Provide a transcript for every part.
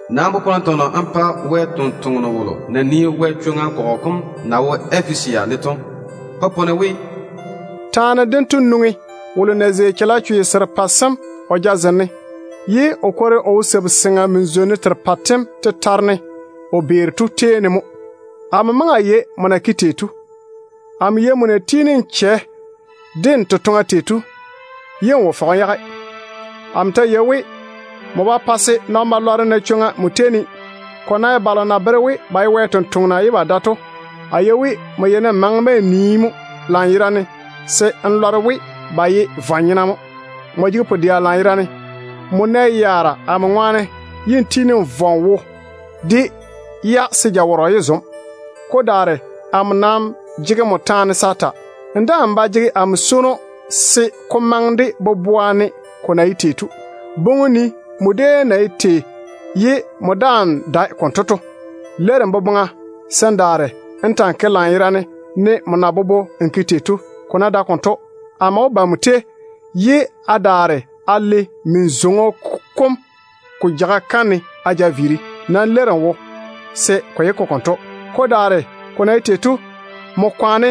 “Nam popone tɔnɔ n pa Wɛ tontoŋeno wolo na nii Yezu kɔgɔ kom na wo Efesia ne to. Popone we: Taane dento nwoŋi wolo na zei chalechwe serepɛ sem o jazem ne, ye o kwori o wo sabu-seŋa min-zwonnu terepɛ tem tetare ne o vei to tei mo. Amo maŋe a yei abam na ke tei to. Amo yei á na tiini á chɛ de á totoŋa tei to, ye á wo fɔge á yage. Amo ta yei we, abam ba pae se nɔn-balwaaro na chwoŋa abam tetare ne. Ko ná ye balo na bere we ba ye Yezu totoŋa nakwa ye ba dae to, a yei we á yeini á maane-ba á nii, ye á lɔre we ba ye vwa-nyena mo. Abam jege pu-dɛa lanyerane. Abam nɛ yaara amo ŋwaane ye á tiini á vɔ á wo de-ya, se á vɔna yé pare. Ko daare amo nam jege abam taane se a ta. Á daa ba jege amo swono se ko maŋe de boboa ne ko na ye tei to. Boŋe-na á nii á déem ya na ye tei ye á daa dae konto to. Leiri-na á boboŋa se á daare á ta‑á ke lanyerane, ne á na bobo á ke tei to. Ko ná dae konto, amo wó ba abam tei ye a daare a le á min-zwoŋo kom ko jeiga kam ne a yage. Nam leiri-na á wo se ko yé ke konto. Ko daare, abam kwaane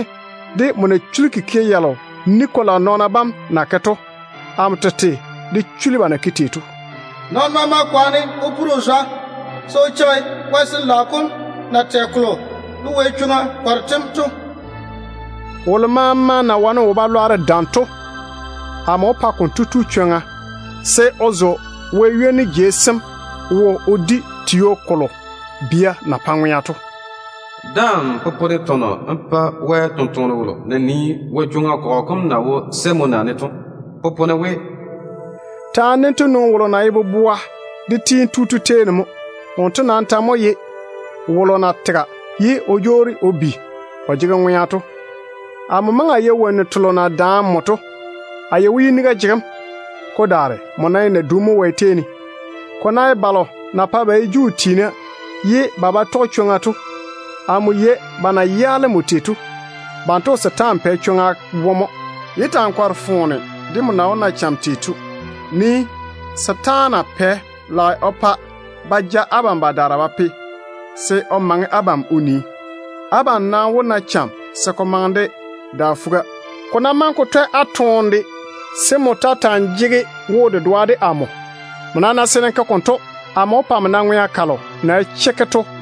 de á na chuli kikia yalo Nikolayi nɔɔna bam na ke to. Amo tete de chuli ba na ke tei to. Nɔɔno maama nam kwaane o pore o zwa se o cheigi Wɛ Sin-laao kom na tɛ kolo de wɛ-di sem nɔɔna bam to. Wolo maama na wane wo-balwaaro dam to, amo wó pa konto tu chwoŋa se o zo Wɛ ywoni jei sem wo o di tio kolo bia na pae ŋwea to. Daa‑n popone tɔnɔ n pa Wɛ tontoŋeno wolo na nii Yezu kɔgɔ kom na wo Semuna ne to. Popone we: Taane dento nwoŋi wolo na ye boboa kam de kweelim tu to tei mo. Wonto nam ta mo ye wolo na tega ye o jwoori o bi o jege ŋwea to. Amo maŋe a yei cham delo na yi abam to ni ne. A yei we yiniga jege abam. Ko daare, abam nam ye naduna mo Wɛ tei ne. Ko ná ye balo na pae ba ye Juu tiina ye ba ba tɔge chwoŋa to, amo yei ba na yaale abam tei to. Banto wo setaana pɛ chwoŋa wone mo. Yé ta‑á kɔre-na foone de á na wó na yaara yalo to. Nii-na! Setaana pɛ lage o pa ba ja abam badaara ba pe, se o maŋe abam o nii. Abam nam wó na cham se ko maŋe de da fuga. Ko ná maŋe ko twɛ á toone de, se á ta ta‑á jege wo-dedoa de Wɛ. Abam ná ke konto, amo wó pa á na Wɛ pɛɛre delo na ye ŋwea chekke to.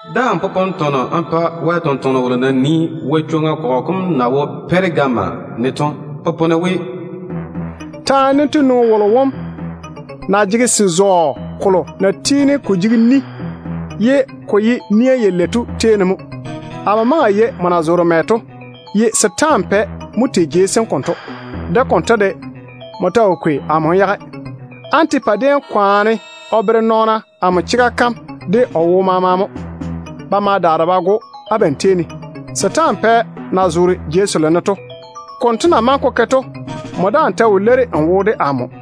Daa‑n popone tɔnɔ n pa Wɛ tontoŋeno wolo na nii Yezu kɔgɔ kom na wo Pɛregama ne to. Popone we: Taane dento nwoŋi wolo wom na jege se-zɔɔ kolo na tiini ko jege ni ye ko ye nia yalei to tei mo. Amo yei abam na zoore mɛ to, ye setaana pɛ mo tei jei sem konto. De konto de, abam ta wo kwei amo á yage. Antipa déem zege amo chega kam kwaga ne de o wo maama mo. Ba ma daare ba go‑o abam tei ne, setaana pɛ na zoore jei selo ne to. De konto na maŋe ko ke to de, abam daa ta wo leiri á wo de amo.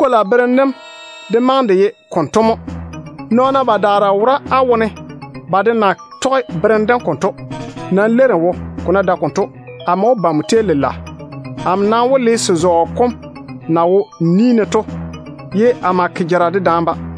Nikolayi berem dem de maŋe de ye konto mo. Nɔɔna badaara wora á wone ba de na tɔge berem dem konto. Nam leiri-na á wo. Ko ná dae konto, amo wó ba abam tei lela. A maa wó le se-zɔɔ kom na wo a ni ne to a ma ke jara dedaane-ba.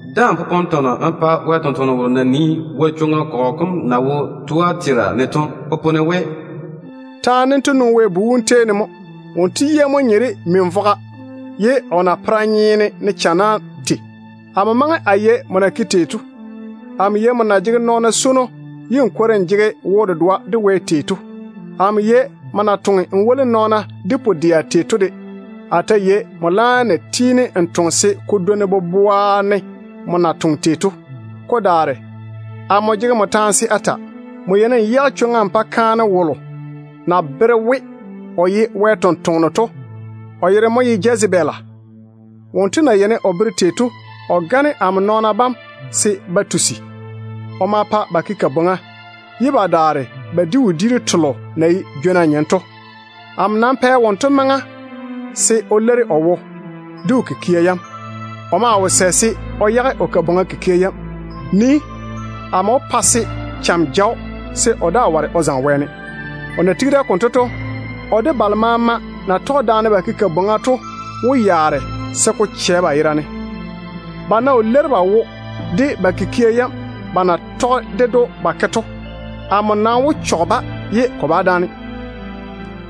Daa‑n popone tɔnɔ n pa Wɛ tontoŋeno wolo na nii Yezu kɔgɔ kom na wo Tuatera ne to. Popone we: Taane dento nwoŋi Wɛ Bu wom tei mo. Wonto yia mo nye de min-vogo, ye o napera nyeena ne channa tei. Amo maŋe a yei abam na ke tei to. Amo yei á na jege nɔɔna swono ye á kwori á jege wo-dedoa de Wɛ tei to. Amo yei abam na toŋe á woli nɔɔna ye á jege pu-dɛa tei to de. A nam ta yei abam na tiini á toŋe leile konto se ko dwoni á na maŋe á toŋe tei boboa ne to. Ko daare, amo jege abam taane se a ta. Abam yeini á yage chwoŋa á pa kaane wolo na bere we o ye Wɛ ni-jwoŋinu to, o yere mo Jezebele. Wonto na yeini o bere amo nɔɔna bam tei to, o gane-ba mo o pae ba tusa. O ma pa ba ke bwoorim, ye ba daare ba di wodiiru telo na ye jwona nyem to. Amo nam pɛ wonto maŋa mo se o leiri o wo de o kikia yam. O maa wo sɛ se o yage o wo-zɔɔna kikia yam. Nii-na. Amo wó pa se jaweo ja‑o se o daa yé wane o zaŋe wɛɛne. O na tigi da konto to, o de balo maama na tɔge daane ba ke bwoorim to wó yaare se ko chɛ ba yera ne. Ba ná wo leiri ba wo de ba kikia yam ba na tɔge ded‑o ba ke to, amo nam wó chɔge-ba lela.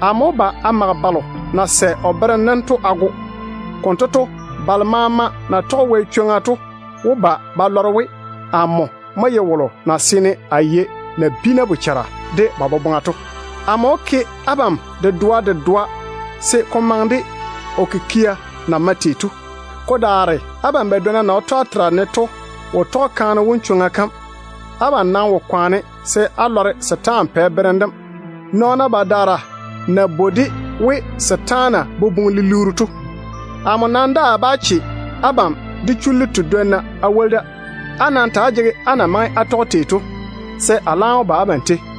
Amo wó mage balo na sɛ o berem dem to a go. Konto to, wɛ-di sem nɔɔna bam maama wó ba ba lɔre we, amo mo ye wolo wom na seene o yei nabiina bochara de ba boboŋa to. Amo wó ke abam dedoa dedoa se ko maŋe de á kikia na mae tei to. Ko daare abam badwonna na wo Tuatera ne to wo tɔge kaane wom konto bera yam. Abam nam wo kwaane se á lɔre setaana pɛ berem dem, nɔɔna badaara na bwoi-de we setaane boboŋ-lilirru to. Amo nam daa bá che abam de chullu tedwonna a woli da. Á nam ta‑á jege abam na maŋe á tɔge tei to, se a laam ba abam tei.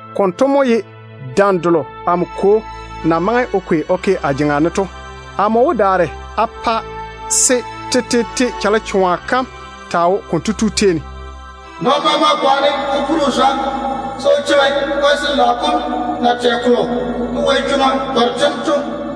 Konto mo ye dam delo amo Kwo na maŋe o kwei o ke a jeŋa ne to. Amo wó daare a pa se tetete chalechoa kam taa wo konto tu tei ne. Nɔɔno maama nam kwaane o pore o zwa se o cheigi Wɛ Sin-laao kom na tɛ kolo de wɛ-di sem nɔɔna bam to.